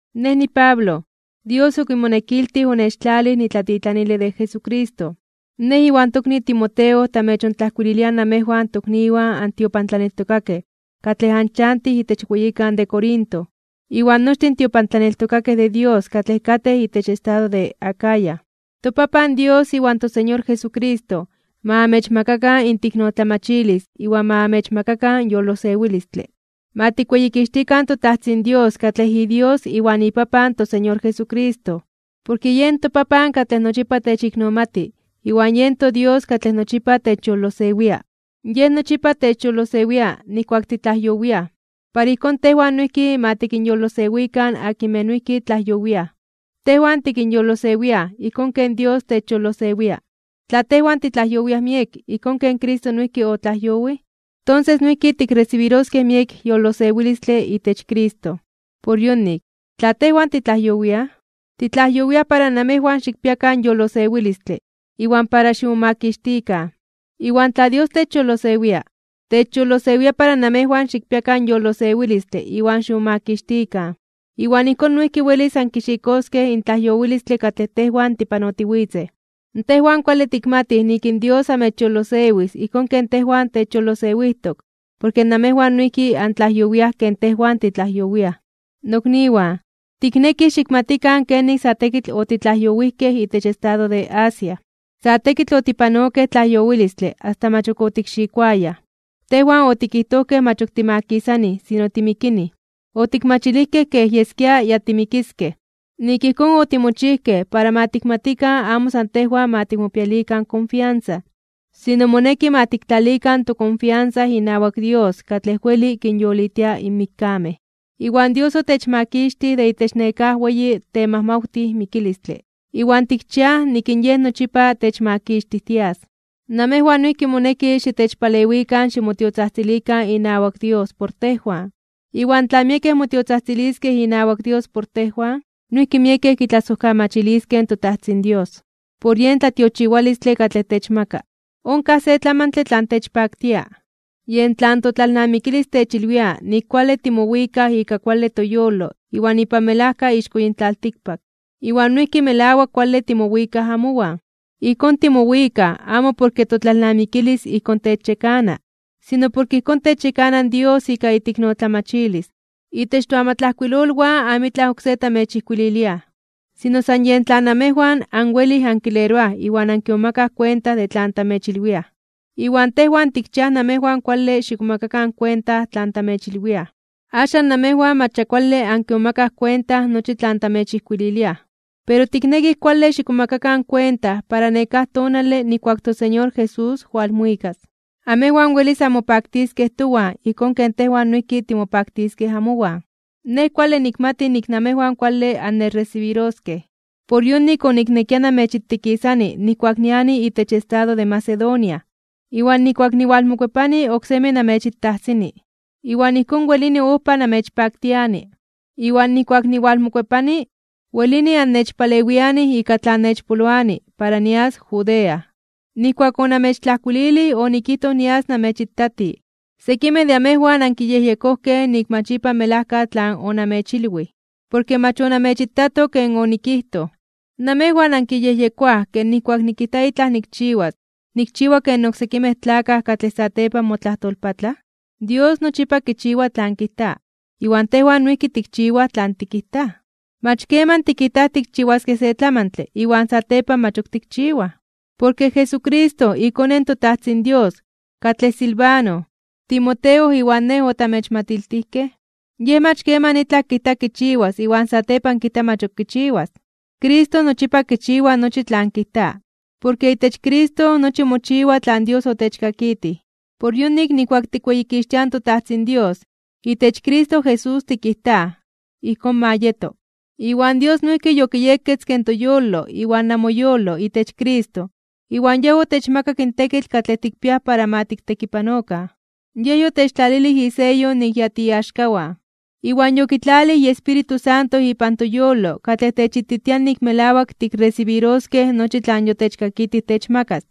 Nej niPablo, Dios okimonekiltij onechtlalij nitlatitlanile de Jesucristo. Nej iwan tokni Timoteo tamechontlajkuililiaj namejwan tokniwan antiopantlaneltokakej katlej anchantij itech weyikan de Corinto, iwan nochtin in tiopantlaneltokakej de Dios katlej katej itech estado de Acaya. In toPapan Dios iwan toSeñor Jesucristo ma amechmakakan inteiknotlamachilis iwan ma amechmakakan yolosewilistle. Ma tikweyikixtikan toTajtzin Dios katlej iDios iwan iPapan in toSeñor Jesucristo, porke yen toPapan katlej nochipa techiknomati iwan yen toDios katlej nochipa techyolosewia. Yej nochipa techyolosewia nijkuak titlajyowiaj, para ijkón tejwan noijki ma tikinyolosewikan akinmej noijki tlajyowiaj. Tejwan tikinyolosewiaj ijkón ken Dios techyolosewia. Tla tejwan titlajyowiaj miek ijkón ken Cristo noijki otlajyowij, tonses noijki tikresibiroskej miek yolosewilistle itech Cristo. Por yonik, tla tejwan titlajyowiaj, titlajyowiaj para namejwan xikpiakan yolosewilistle iwan para ximomakixtikan. Iwan tla Dios techyolosewia, techyolosewia para namejwan xikpiakan yolosewilistle iwan ximomakixtikan, iwan ijkón noijki welis ankixikoskej in tlajyowilistle katlej tejwan tipanotiwitzej. Tejwan kuale tikmatij nik in Dios amechyolosewis ijkón ken tejwan techyolosewijtok porke namejwan noijki antlajyowiaj ken tejwan titlajyowiaj. Nokniwan, tiknekij xikmatikan kenik sa tekitl otitlajyowijkej itech estado de Asia. Sa tekitl otipanokej tlajyowilistle asta mach ok otikxikoayaj, tejwan otikijtojkej mach ok timakisanij sino timikinij. Otikmachilijkej kej yeskia ya timikiskej. Nik ijkón otimochijkej para ma tikmatikan amo san tejwan ma tikmopialikan konfiansa, sino moneki ma tiktlalikan tokonfiansa inawak Dios katlej weli kinyolitia in mikkamej. Iwan Dios otechmakixtij de itech nekáj weyi temajmawtij mikilistle. Iwan tikchiaj nik in Yej nochipa techmakixtijtias. Namejwan noijki moneki xitechpalewikan ximotiotzajtzilikan inawak Dios por tejwan. Iwan tla miekej motiotzajtziliskej inawak Dios por tejwan, noijki miekej kitlasojkamachiliskej in toTajtzin Dios, por yen tlatiochiwalistle katlej techmaka. Onkaj se tlamantle tlan techpaktia, yen tlan totlalnamikilis techilwia nik kuale timowikaj ika kuale toyolo iwan ipan melajka ixko yin tlaltikpak, iwan noijki melawak kuale timowikaj amowan. Ijkón timowikaj amo porke totlalnamikilis ijkón techyekana, sino porke ijkón techyekana in Dios ika iteiknotlamachilis. Itech toamatlajkuilolwan amitlaj oksé tamechijkuililiaj, sino san yen tlan namejwan anwelij ankileroaj iwan ankimomakaj kuenta de tlan tamechilwiaj. Iwan tejwan tikchiaj namejwan kuale xikmomakakan kuenta tlan tamechilwiaj. Axan namejwan mach ya kuale ankimomakaj kuenta nochi tlan tamechijkuililiaj. Pero tiknekij kuale xikmomakakan kuenta para nekáj tonale nijkuak in toSeñor Jesús walmuikas, amejwan welis anmopaktiskej towan ijkón ken tejwan noijki timopaktiskej amowan. Nej kuale nikmati nik amejwan kuale annechresibiroskej. Por yonik oniknekia namechitikisani nijkuak niani itech estado de Macedonia, iwan nijkuak niwalmokuepani oksemi namechitajsini, iwan ijkón welini ojpa namechpaktiani. Iwan nijkuak niwalmokuepani, welini annechpalewianij ika tlan nechpoloani para nias Judea. Nijkuak onamechtlajkuililij onikijtoj nias namechitati. Sekimej de amejwan ankiyejyekojkej nik mach ipan melajka tlan onamechilwij, porke mach onamechitato ken onikijtoj. ¿Namejwan ankiyejyekoaj ke nijkuak nikijta itlaj nikchiwas, nikchiwa ken oksekimej tlakaj katlej satepan motlajtolpatlaj? Dios nochipa kichiwa tlan kijta, iwan tejwan noijki tikchiwaj tlan tikijtaj, mach keman tikijtaj tikchiwaskej se tlamantle iwan satepan mach ok tikchiwaj. Porke Jesucristo, iKone in toTajtzin Dios, katlej Silvano, Timoteo iwan nej otamechmatiltijkej, Yej mach keman itlaj kijta kichiwas iwan satepan kijta mach ok kichiwas. Cristo nochipa kichiwa nochi tlan kijta. Porke itech Cristo nochi mochiwa tlan Dios otechkakitij. Por yonik nijkuak tikweyikixtiaj in toTajtzin Dios, itech Cristo Jesús tikijtaj: “Ijkón ma yeto.” Iwan Dios noijki yokiyeketzke in toyolo iwan namoyolo itech Cristo iwan Yej otechmakak in tekitl katlej tikpiaj para ma tiktekipanokan. Yej yotechtlalilij iseyo nik ya tiiaxkawan, iwan yokitlalij iEspíritu Santo ipan toyolo katlej techititia nik melawak tikresibiroskej nochi tlan yotechkakitij techmakas.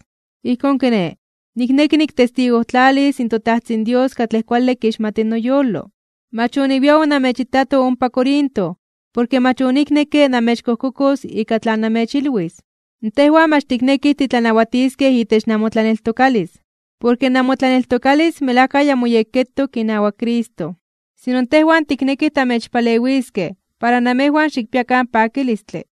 Ijkón kiné, nikneki niktestigojtlalis in toTajtzin Dios katlej kuale kixmati noyolo. Mach oniwia onamechitato ompa Corinto, porke mach oniknekke namechkojkokos ika tlan namechilwis. Tejwan mach tiknekij titlanawatiskej itech namotlaneltokalis, porke namotlaneltokalis melajka ya moyekketok inawak Cristo. Sino tejwan tiknekij tamechpalewiskej para namejwan xikpiakan pakilistle.